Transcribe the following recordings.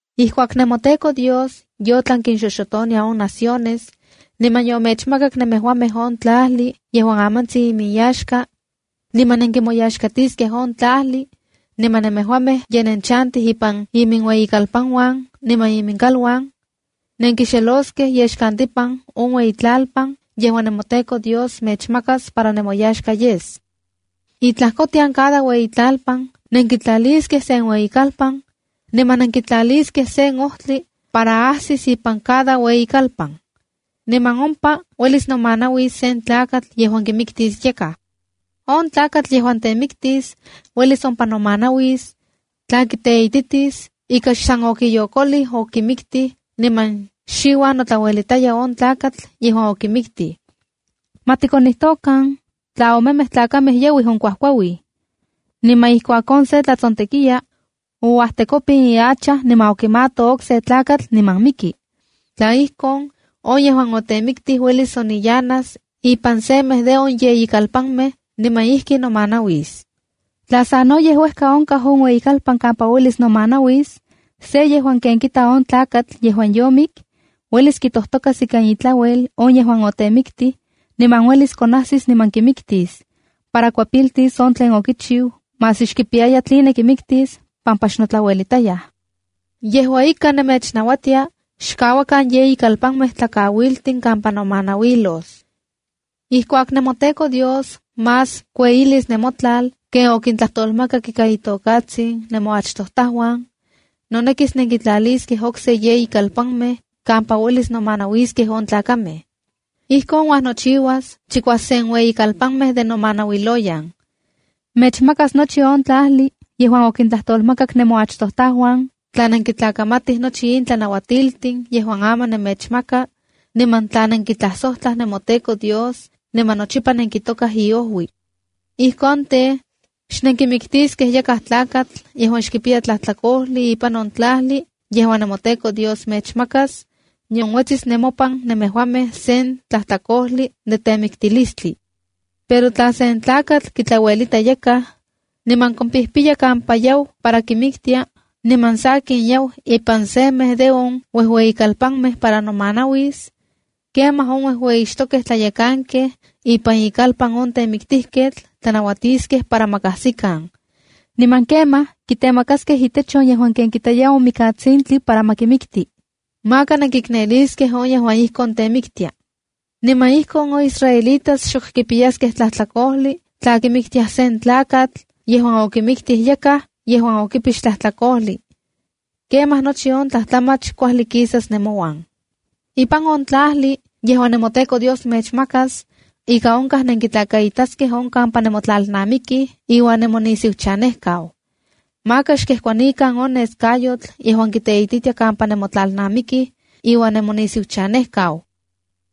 ’Ijkuak nemoTEKO Dios yotlan kinxoxotonia on naciones, niman yomechmakak nemejuamej on tlajli yejuan amantsin iminyaxka, niman nenkimoyaxkiskej on tlajli, niman nemejuamej ye nenchantij ipan iminueyikalpanuan niman iminkaluan, nenkixeloskej yexkantipan on ueyitlalpan yejuan nemoTEKO Dios mechmakas para nemoyaxka yes. Itlajkotian cada ueyitlalpan, nenkitlaliskej sen ueyikalpan, niman nenkitlaliskej sen ojtli para ajsis ipan cada ueyikalpan. Niman ompa uelis nomanauis sen tlakatl yejuan kimiktis yakaj. ’On tlakatl yejuan temiktis uelis ompa nomanauis, tla kiteititis ika xsan okiyokolij okimiktij niman xiuan notlauelitayaj on tlakatl yejuan okimiktij. Ma tikonijtokan, tla omemej tlakamej yauij onkuajkuauij. Niman ijkuak on se tlatsontekiya, ouajtekopin ihacha niman okimato okse tlakatl niman miki. Tla ijkon, on yejuan otemiktij uelis oniyanas ipan semej de on yeyi kalpanmej niman ijki nomanauis. Tla sanoyej uejka onkaj on ueyikalpan kampa uelis nomanauis, se yejuan ken kita on tlakatl yejuan yomik, uelis kitojtokas ikan itlauel on yejuan otemiktij, niman uelis konajsis niman kimiktis para kuepiltis on tlen okichiu maski xkipiyaya tline kimiktis, pampa xnotlauelitayaj. Yejua ika, nemechnauatia xkauakan yeyi kalpanmej tlakauiltin kampa nomanauilos. ’Ijkuak nemoTEKO Dios más kueyilis nemotlal ken okintlajtolmakak ika itokatsin nemoachtojtajuan, nonekis nenkitlaliskej okse yeyi kalpanmej kampa uelis nomanauiskej on tlakamej. Ijkon uajnochiuas chikuasen ueyikalpanmej de nomanauiloyan. Mechmakas nochi on tlajli yejuan okintlajtolmakak nemoachtojtajuan tla nenkitlakamatij nochi in tlanauatiltin yejuan aman nemechmaka, niman tla nenkitlajsojtlaj nemoTEKO Dios niman nochipa nenkitokaj iojui. Ijkon tej, xnenkimiktiskej yakaj tlakatl yejuan xkipiya tlajtlakojli ipan on tlajli yejuan nemoTEKO Dios mechmakas, nion uetsis nemopan nemejuamej sen tlajtlakojli de temiktilistli. ’Pero tla sen tlakatl kitlauelita yakaj, niman kompijpiya kampa yau para kimiktia, niman sakin, yau ipan semej de on uejueyikalpanmej para nomanauis, kemaj on uejueyixtokej tlayekankej ipan ikalpan on temiktijketl tlanauatiskej para ma kajsikan. Niman kemaj kitemakaskej itech on yejuan ken kitaya on mikatsintli para ma kimikti. Maka nenkikneliskej on yejuan ijkon temiktia. Niman ijkon on israelitas xok kipiyaskej tlajtlakojli tla kimiktiaj sen tlakatl yejuan okimiktij yakaj yejuan xokipix tlajtlakojli. Kemaj nochi on tlajtlamach kuajli kisas nemouan. ’Ipan on tlajli yejuan nemoTEKO Dios mechmakas, ika onkaj nenkitlakaitaskej on kampa nemotlalnamikij iuan nemonisiuchanejkau. Maka xkejkuanikan on neskayotl yejuan kiteititia kampa nemotlalnamikij iuan nemonisiuchanejkau.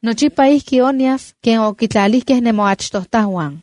Nochipa ijki onyas ken okitlalijkej nemoachtojtajuan.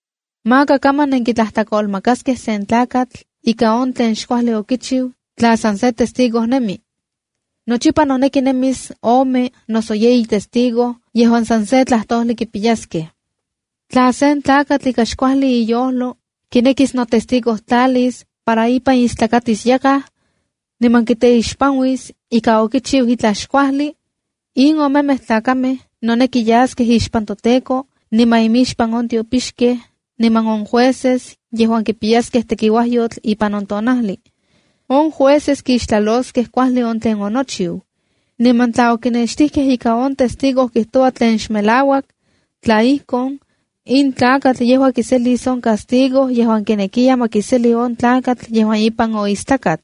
’Maka kaman nenkitlajtlakolmakaskej sen tlakatl ika on tlen xkuajli okichiu tla san se testigo nemi. Nochipa noneki nemis ome noso yeyi testigo yejuan san se tlajtojli kipiyaskej. ’Tla sen tlakatl ika xkuajli iyojlo kinekis notestigotlalis para ipan istlakatis yakaj, niman kiteixpanuis ika okichiu itlaj xkuajli, in omemej tlakamej noneki yaskej ixpan toTEKO niman imixpan on tiopixkej niman on jueces yejuan kipiyaskej tekiuajyotl ipan on tonajli. On jueces kixtlaloskej kuajli on tlen onochiu. Niman tla okinextijkej ika on testigo kijtoua tlen xmelauak, tla ijkon, in tlakatl yejua kiselis on castigo yejuan kinekiya ma kiseli on tlakatl yejuan ipan oistlakat.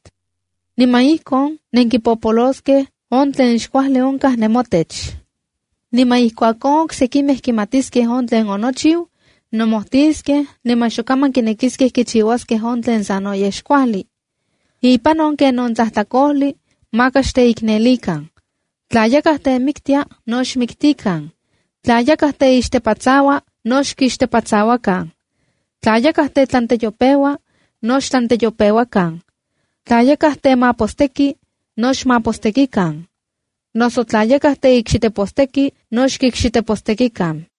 Niman ijkon nenkipopoloskej on tlen xkuajli onkaj nemotech. ’Niman ijkuak on oksekimej kimatiskej on tlen onochiu, nomojtiskej niman xok kaman kinekiskej kichiuaskej on tlen sanoyej xkuajli. Ipan on kenon tlajtlakojli, maka xteiknelikan. Tla yakaj temiktia, no xmiktikan. Tla yakaj teixtepatsaua, no xkixtepatsauakan. Tla yakaj tetlanteyopeua no xtlanteyopeuakan. Tla yakaj temateposteki, no xmatepostekikan. Noso tla yakaj teikxiteposteki no xkikxitepostekikan.